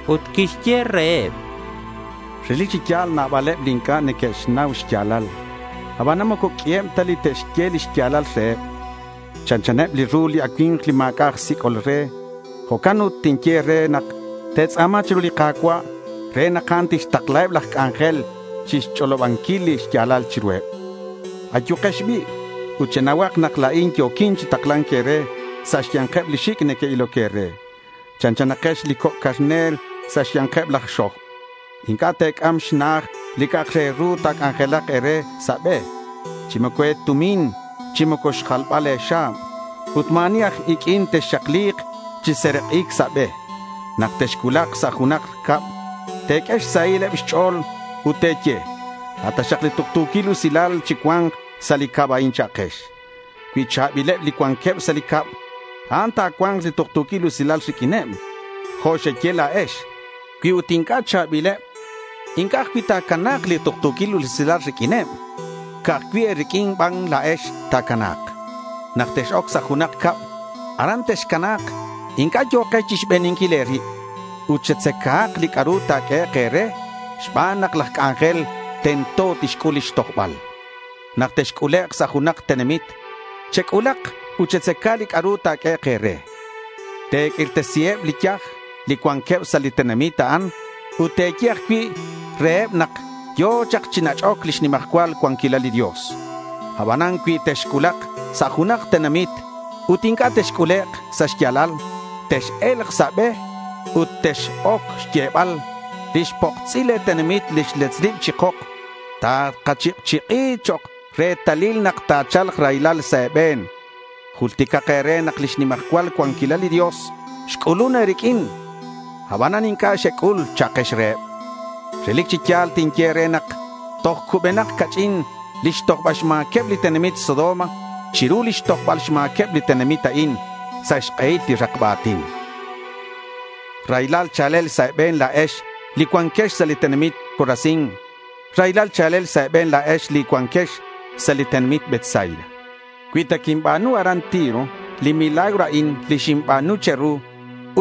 Ut quixye reheb, —Relic chi ya̱l nabaleb li inc'a' neque'xnau xya̱lal. Abanan moco q'uiheb ta li te'xye li xya̱lal reheb. Chanchaneb li ru li acui̱mk li ma̱c'a' aj sic'ol re. Jo'can ut tinye e̱re nak te̱tz'a̱ma chiru li Ka̱cua' re nak a'an tixtaklaheb laj c'anjel chixch'olobanquil li xya̱lal chiruheb. Ayukex bi' ut chenauhak nak la̱in yo̱quin chi takla̱nc e̱re sa' xya̱nkeb li xic' neque'iloc e̱re. Chanchanakex li coc' carner sa' xya̱nkeb laj xoj. Inc'a' te̱c'am xna'aj li c'a'ak re ru ta̱c'anjelak e̱re sa' be, chi moco e̱tumin, chi moco xjalbal e̱xa̱b. Ut ma̱ ani aj iq'uin texxakli̱k chi serak'ic sa' be. Nak texcuulak sa' junak cab, te̱q'ue xsahileb xch'o̱l ut te̱ye, “A' taxak li tuktu̱quil usilal chi cua̱nk sa' li cab a'in,” cha'kex. Cui cha̱bileb li cuanqueb sa' li cab a'an, ta̱cua̱nk li tuktu̱quil usilal riq'uineb jo' xeye la̱ex. Cui ut inc'a' cha̱bileb, inc'a' ajcui' ta̱cua̱nk li tuktu̱quil usilal riq'uineb. Ca'aj cui' e̱riq'uin ban la̱ex ta̱cana̱k. Nak tex-oc sa' junak cab, aran texcana̱k. Inc'a' yo̱kex chixbeninquil e̱rib. Ut chetzacahak li c'a'ru ta̱q'uehek' e̱re xban nak laj c'anjel tento tixc'ul lix tojbal. Nak texc'ulek' sa' junak tenamit, chec'ulak ut chetzaca li c'a'ru ta̱q'uehek' e̱re. Te̱q'uirtesiheb li yaj li cuanqueb sa' li tenamit a'an ut te̱ye ajcui' reheb nak yo̱ chak chi nach'oc lix nimajcual cuanquilal li Dios. Abanan cui texcuulak sa' junak tenamit ut inc'a' texc'ulek' sa' xya̱lal, tex-e̱lk sa' be ut tex-oc xyebal, “Lix poksil le̱ tenamit li xletz chi kok takachik'chik'i chok' retalil nak ta̱cha̱lk raylal sa' e̱be̱n. Julticak e̱re nak lix nimajcual cuanquilal li Dios xc'ulun e̱riq'uin, abanan inc'a' xec'ul”, cha'kex reheb. Relic chi ya̱l tinye e̱re nak toj cubenak ca'ch'in lix tojbal xma̱queb li tenamit Sodoma chiru lix tojbal xma̱queb li tenamit a'in sa' xk'ehil li rakba a̱tin. Raylal cha̱lel sa' e̱be̱n la̱ex li cuanquex sa' li tenamit Corazín. Raylal cha̱lel sa' e̱be̱n la̱ex li cuanquex sa' li tenamit Betsaida. Cui ta quinba̱nu aran Tiro li milagro a'in li xinba̱nu che̱ru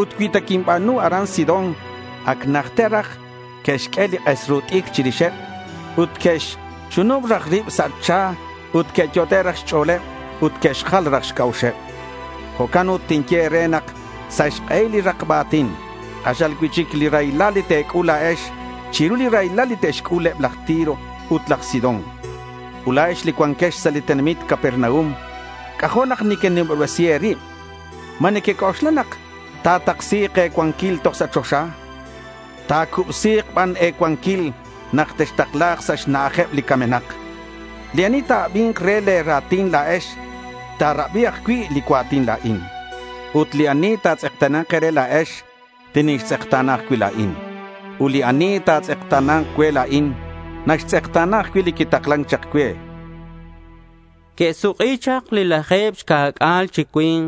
ut cui ta quinba̱nu aran Sidón, ac najter raj que'xq'ue li k'es ru t'icr chirixeb ut que'xchunub raj rib sa' cha ut que'yot'e' raj xch'o̱leb ut que'xjal raj xc'a'uxeb. Jo'can ut tinye e̱re nak sa' xk'ehil li rakba a̱tin, k'axal cui'chic li raylal li te̱c'ul la̱ex chiru li raylal li te'xc'ul eb laj Tiro ut eb laj Sidón. Ut la̱ex li cuanquex sa' li tenamit Capernaum, c'ajo' nak nequenimobresi e̱rib. ¿Ma nequec'oxla nak ta̱taksi̱k e̱cuanquil toj sa' choxa? Ta̱cubsi̱k ban e̱cuanquil nak textakla̱k sa' xna'ajeb li camenak. Li ani ta̱abi̱nk re le̱ ra̱tin la̱ex, ta̱rabi ajcui' li cua̱tin la̱in. Ut li ani ta̱tz'ekta̱na̱nk e̱re la̱ex, tinixtz'ekta̱na ajcui' la̱in. Ut li ani natz'ekta̱nan cue la̱in, naxtz'ekta̱na ajcui' li quitaklan chak cue, chan li Jesús. Que'suk'i chak li laje̱b xca̱c'a̱l chi cui̱nk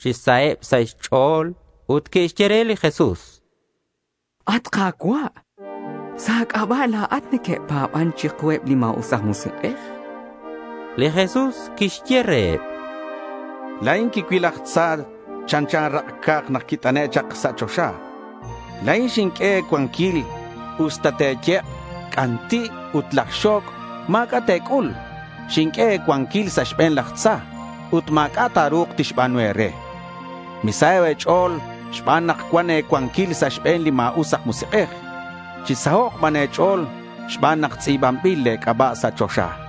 chi saheb sa' xch'o̱l ut que'xye re li Jesús: —At Ka̱cua', sa' a̱c'aba' la̱at neque'pa̱ban chiku eb li ma̱us aj musik'ej, chanqueb. Li Jesús quixye reheb: —La̱in quicuil laj tza chanchan rak' ca̱k nak quit'ane' chak sa' choxa. La̱in xinq'ue e̱cuanquil. Usta te̱yek' li c'anti' ut laj xo̱c', ma̱c'a' te̱c'ul. Xinq'ue e̱cuanquil sa' xbe̱n laj tza ut ma̱c'a' ta̱ru̱k tixba̱nu e̱re. Misaho' sa' e̱ch'o̱l xban nak cuan e̱cuanquil sa' xbe̱neb li ma̱us aj musik'ej. Chisahok' ban e̱ch'o̱l xban nak tz'i̱banbilak le̱ c'aba' sa' choxa, chan.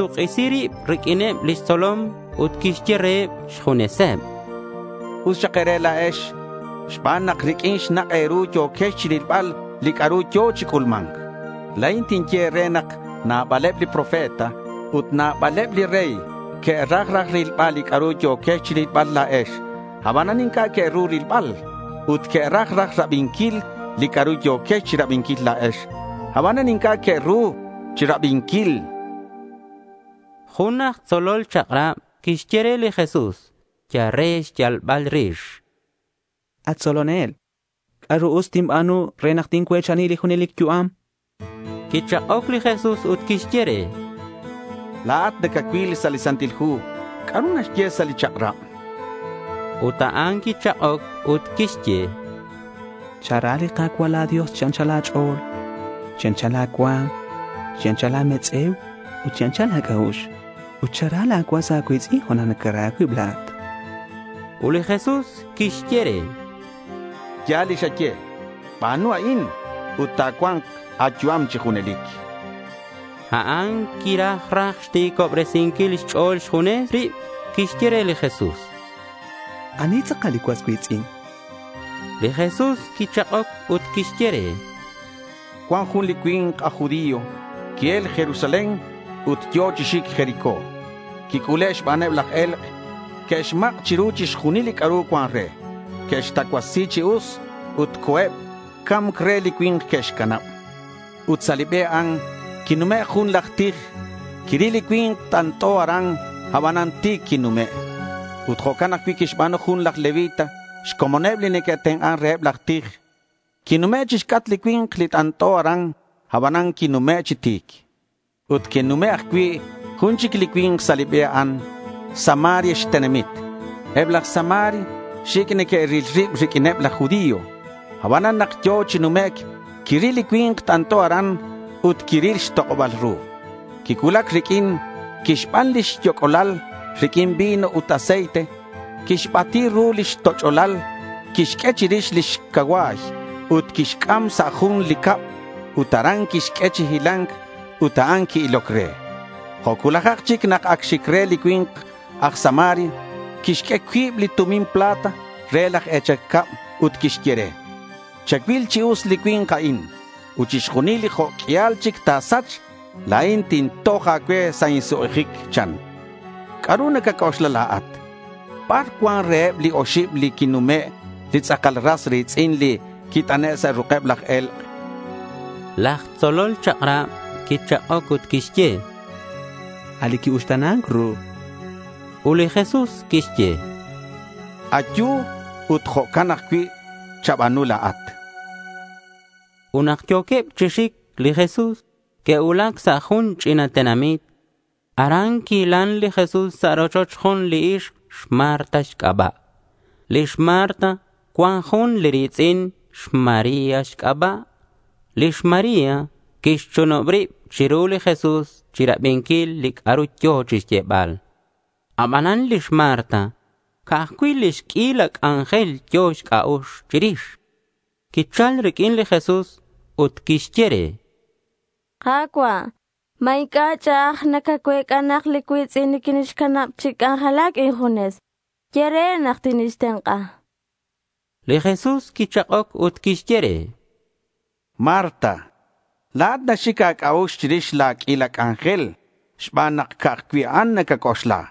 Quixsuk'isi rib riq'uineb lix tzolom ut quixye reheb xjuneseb: —Us xak e̱re la̱ex xban nak riq'uin xnak' e̱ru yo̱quex chirilbal li c'a'ru yo̱ chi c'ulma̱nc. La̱in tinye e̱re nak nabaleb li profeta ut nabaleb li rey que'raj raj rilbal li c'a'ru yo̱quex chirilbal la̱ex, abanan inc'a' que'ru rilbal. Ut que'raj raj rabinquil li c'a'ru yo̱quex chirabinquil la̱ex, abanan inc'a' que'ru rabinquil, chan li Jesús reheb. Jun aj tzolol chak'rab quixye re li Jesús yal re xyalbal rix: —At tzolonel: ¿C'a'ru us tinba̱nu re nak tincue̱chani li junelic yu'am? chan. Quichak'oc li Jesús ut quixye re: —La̱at nacacuil sa' li Santil Hu. ¿C'a'ru naxye sa' li chak'rab?— Ut a'an quichak'oc ut quixye: —Chara li Ka̱cua' la̱ Dios chi anchal a̱ch'o̱l, chi anchal a̱cua̱m, chi anchal a̱metz'e̱u ut chi anchal a̱c'a'ux. Ut chara la̱ cuas a̱cui̱tz'in jo' nak nacara a̱cuib la̱at, chan. Ut li Jesús quixye re: —Ya̱l li xaye. Ba̱nu a'in ut ta̱cua̱nk a̱yu'am chi junelic, chan. A'an quiraj raj xti̱cobresinquil xch'o̱l xjunes rib. Quixye re li Jesús: —¿Ani tz'akal li cuas cui̱tz'in? chan. Li Jesús quichak'oc ut quixye re: —Cuan jun li cui̱nk aj judío qui-el Jerusalén ut yo̱ chi xic Jericó. Quic'ule' xbaneb laj e̱lk'. Que'xmak' chiru chixjunil li c'a'ru cuan re. Que'xtacuasi chi us ut co̱eb. Ca̱mc re li cui̱nk que'xcanab. Ut sa' li be a'an quinume' jun laj tij. Quiril li cui̱nk t'ant'o aran, aban ti̱c quinume'. Ut jo'can ajcui' quixba̱nu jun laj levita xcomoneb li neque'tenk'an reheb laj tij. Quinume' chixc'atk li cui̱nk li t'ant'o aran, abanan quinume' chi ti̱c. Ut quinume' ajcui' jun chic li cui̱nk sa' li be a'an, Samaria xtenamit. Eb laj Samaria xic' neque'ril rib riq'uineb laj judío. Abanan nak yo̱ chi numec' quiril li cui̱nk t'ant'o aran ut quiril xtok'oba̱l ru. Quicuulac riq'uin. Quixban lix yoc'olal riq'uin vino ut aceite. Quixbati ru lix toch'olal. Quixq'ue chirix lix cacua̱y ut quixc'am sa' jun li cab ut aran quixq'ue chi hila̱nc ut a'an qui-iloc re. Jo' cuulajak chic nak ac xic re li cui̱nk aj Samaria, quixq'ue cuib li tumin plata re laj e̱chal cab ut quixye re: —Chacuil chi us li cui̱nk a'in. Ut chixjunil li jo' q'uial chic ta̱sach, la̱in tintoj a̱cue sa' insuk'ijic, chan. ¿C'a'ru nacac'oxla la̱at? ¿Bar cuan reheb li oxib li que'nume' li tz'akal ras ri̱tz'in li quit'ane' sa' ruk'eb laj e̱lk'? chan. Laj tzolol chak'rab quichak'oc ut quixye: —A' li qui-uxta̱nan ru, chan. Ut li Jesús quixye re: —Ayu ut jo'can ajcui' chaba̱nu la̱at, chan. Ut nak yo̱queb chi xic li Jesús, que'cuulac sa' jun ch'ina tenamit. Aran quihilan li Jesús sa' rochoch jun li ixk xMarta xc'aba'. Lix Marta cuan jun li ri̱tz'in xMaría xc'aba'. Lix María quixchunub rib chiru li Jesús chirabinquil li c'a'ru yo̱ chixyebal. Abanan lix Marta ca'aj cui' lix q'uila c'anjel yo̱ xc'a'ux chirix. Quichal riq'uin li Jesús ut quixye re: —Ka̱cua', ¿ma inc'a' ch'a'aj nacacuec'a nak li cui̱tz'in niquinixcanab chi c'anjelac injunes? Ye re nak tinixtenk'a, chan. Li Jesús quichak'oc ut quixye re: —Marta, la̱at naxic a̱c'a'ux chirix la̱ q'uila c'anjel xban nak ca'aj cui' a'an nacac'oxla.